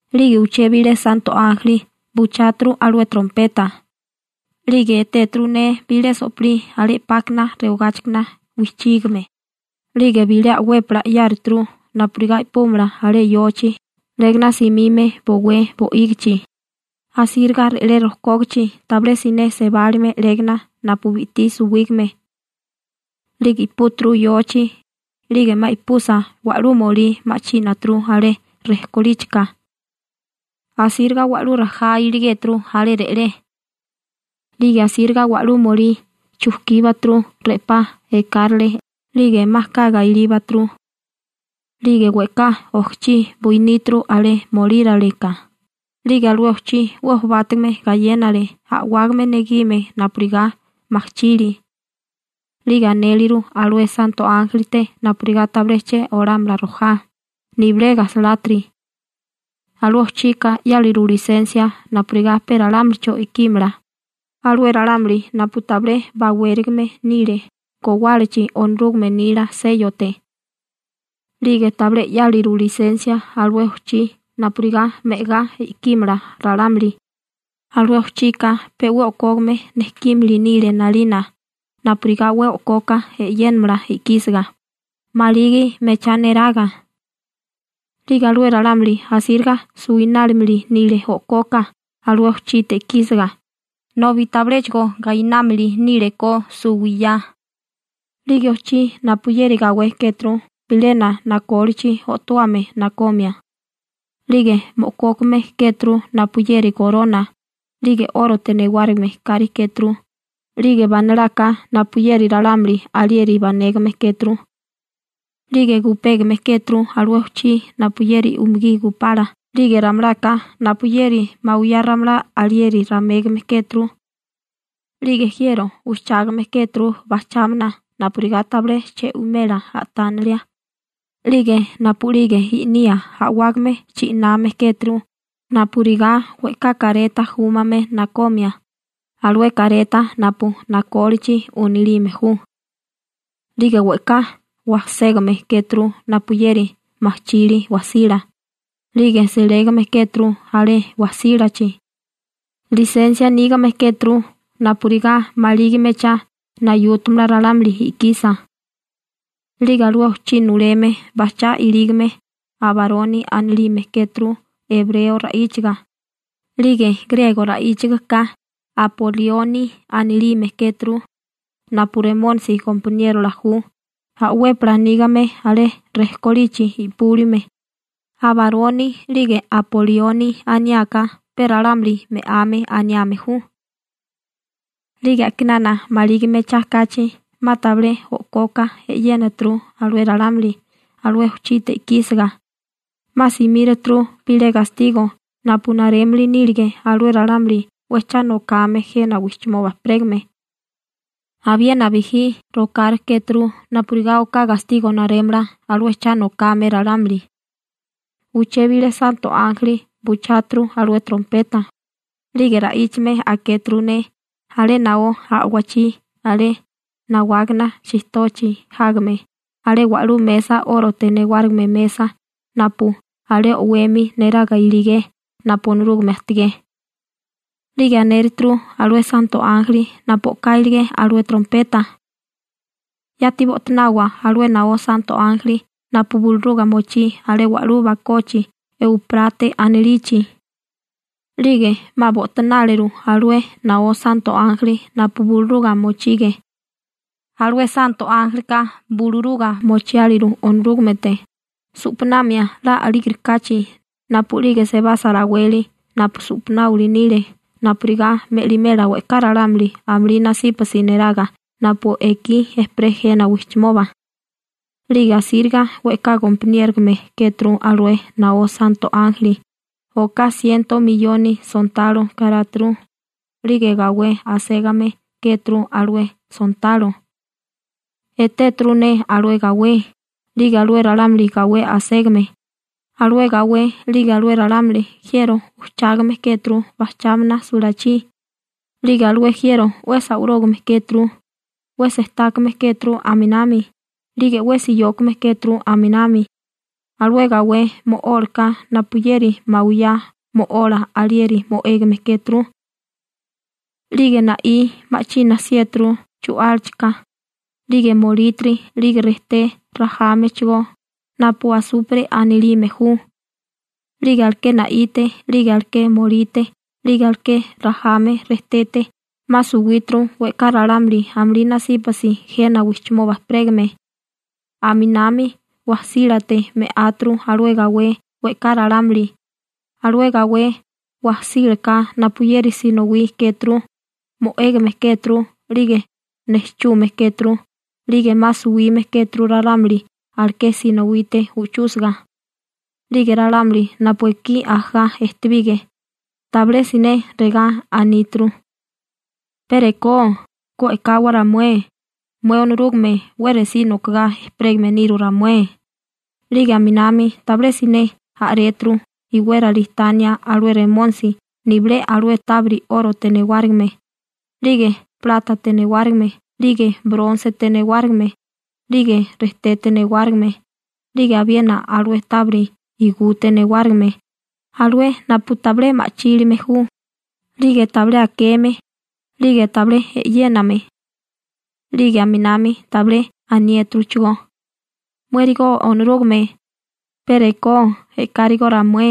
'Lige uché bilé santo ánjeli bucháturu alué trompeta, 'lige etéturu ne bilé so'pilí alé 'pákana rewagáchikana wijchígame, 'lige bilé a'wépala 'yáruturu napurigá i'púmala alé yochi 'légana simime bowé bo'ígichi, asíriga re'lé rojkógichi tabilé siné sebálime 'légana napu bi'tí suwígame. 'Lige i'púturu yochi, 'lige 'ma i'pusa, wa'lú molí ma'chínaturu alé rejkolíchika. Asíriga wa'lú rajá iligéturu alé re'lé. 'Lige asíriga wa'lú molí chujkíbaturu re'pá ekárale 'lige 'ma kaga ilíbaturu. 'Lige we'ká ojchí buiníturu alé molíraleka, 'lige alué ojchí 'we jobátigame gayénale, a'wágame negime napurigá majchili. 'Lige anéleru alué santo ánjelite napurigá tabilé che olámala rojá, nibilé gajsalátiri. Alué ojchika 'yáliru lisensia napurigá pe ralámulicho i'kímala, alué ralámuli napu tabilé bawérigame nile gowálachi Onorúgame nila séyote. 'Lige tabilé 'yáliru lisensia alué ojchí napurigá me'agá i'kímala ralámuli, alué ojchika pe 'we o'kógame nejkímili nile 'nalina napurigá 'we o'koka e'yénamala i'kísiga, maligi mechá neraga. 'Lige alué ralámuli asíriga suwinálimili nile o'koka alué ojchite i'kísiga, nobi tabiléchigo gainámili nílekó suwiyá. 'Lige ojchí napuyeri gawé kéturu bilena nakólichi o'towame nakomia. 'Lige mo'kókame kéturu napuyeri gorona, 'lige 'órote newárigime kari kéturu, 'lige banalaka napuyeri ralámuli alieri banégame kéturu. 'Lige gupégame kéturu alué ojchí napuyeri umugí gupala 'lige ramalaka napuyeri mawiyá ramalá alieri ramégame kéturu. 'Lige jiero ujchágame kéturu bajchámana napurigá tabilé che'wimela a'tánalia, 'lige napu'lige i'nía a'wágame chi'name kéturu napurigá we'ká kareta júmame nakomia alué kareta napu nakólichi unilime ju, 'lige we'ká wajségame kéturu napuyeri majchili wajsila, 'lige selégame kéturu alé wajsílachi, lisensia nígame kéturu napurigá maligi mechá nayútamala ralámuli i'kisa. 'Lige alué ojchí nuleme bajchá ilígame Abaroni anilime kéturu ebreo ra'íchaga, 'lige griego ra'íchagaká Apolioni anilime kéturu napu Remónisi gompaniérola ju a'wépala nígame alé rejkolichi i'púlime. Abaroni 'lige Apolioni aniáká pe «Ralámuli Me'ame» aniame ju. 'Lige a'kinana maligi mechá kachi 'ma tabilé o'koka e'yénituru alué ralámuli alué ojchite i'kísiga, 'ma simíraturu bilé gastigo napu narémili nílige alué ralámuli 'we cha nokame jena wijchimoba ejperégame. Abiena bijí rokárikéturu napurigá oká gastigo narémala alué cha nokame ralámuli. Uché bilé santo ánjeli bucháturu alué trompeta, 'lige ra'íchame akéturu ne alé naó a'wachí alé nawágana chijtochi jágame alé wa'lú mesa 'órote newárigime mesa napu alé o'wemi neraga iligé napu Onorúgame ajtigé. 'Lige anéruturu alué santo ánjeli napu o'ká iligé alué trompeta: ―Yati bo'tanawa alué naó santo ánjeli napu buluruga mochí alé wa'lú bakochi Euprate anilichi. 'Lige 'ma bo'tanáleru alué naó santo ánjeli napu buluruga mochige. Alué santo ánjelika buluruga mochiáliru Onorúgamete, su'panamia 'la a'lígerikáchi napu'lige sebasa raweli napu su'panáwali nile napurigá me'limela we'ká ralámuli amulí nasípasi neraga napu ekí ejperé jena wijchimoba. 'Lige asíriga we'ká gompaniérogame kéturu alué naó santo ánjeli, oká siento miyoni sontalo karáturu. 'Lige gawé aségame kéturu alué sontalo. Etéturu ne alué gawé, 'lige alué ralámuli gawé aségame. Alué gawé 'lige alué ralámuli jiero ujchágame kéturu bajchámana sulachí. 'Lige alué jiero 'we sawarógame kéturu, 'we sejtákame kéturu aminami, 'lige 'we siyókame kéturu aminami. Alué gawé mo'ólaka napuyeri mawiyá mo'ola alieri mo'égame kéturu, 'lige na'í ma'china 'siéturu chu'álachika, 'lige molítiri, 'lige rejté rajámechigó napu asupre anilime ju. 'Lige aleké na'ite 'lige aleké molite 'lige aleké rajame rejtete 'ma suwíturu we'ká ralámuli amulí nasípasi jena wijchimoba ejperégame. Aminami wajsílate me'áturu alué gawé we'ká ralámuli, alué gawé wajsílaka napuyeri sinowí kéturu, mo'égame kéturu 'lige nejchume kéturu, 'lige 'ma suwime kéturu ralámuli aleké sinowite u'chúsiga. 'Lige ralámuli napu ekí ajagá ejtebige, tabilé siné regá aníturu: ―Pe rekó ku e'kawa ramué mué Onorúgame 'we resí nokagá ejperégame niru ramué. 'Lige aminami tabilé siné a'réturu iwérali tania alué Remónisi nibilé alué tábiri 'órote newárigime, 'lige plátate newárigime 'lige brónsete newárigime, 'lige rejtete newárigime, 'lige abiena alué tábiri igute newárigime alué napu tabilé ma'chílime ju, 'lige tabilé akeme, 'lige tabilé e'yéname. 'Lige aminami tabilé aniéturuchigó: ―Muérigo Onorúgame, pe rekó e'kárigó ramué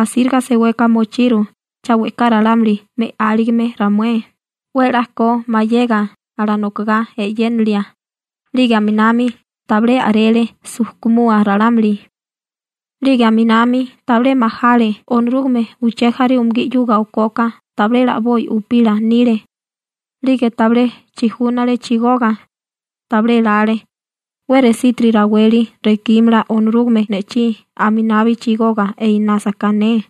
asíriga seweka mochiru cha we'ká ralámuli me'áligime ramué 'we 'la ko mayega alanokogá e'yénilia. 'Lige aminami tabilé a'rele sujkumua ralámuli, 'lige aminami tabilé majale Onorúgame uché jaré umugí 'yuga okoka tabilé 'la a'boi upila nile. 'Lige tabilé chijúnale chigoga. Tabilé lale: «'We resítiri raweli rekímala Onorúgame ne'chí aminabi chigoga einásaká ne.»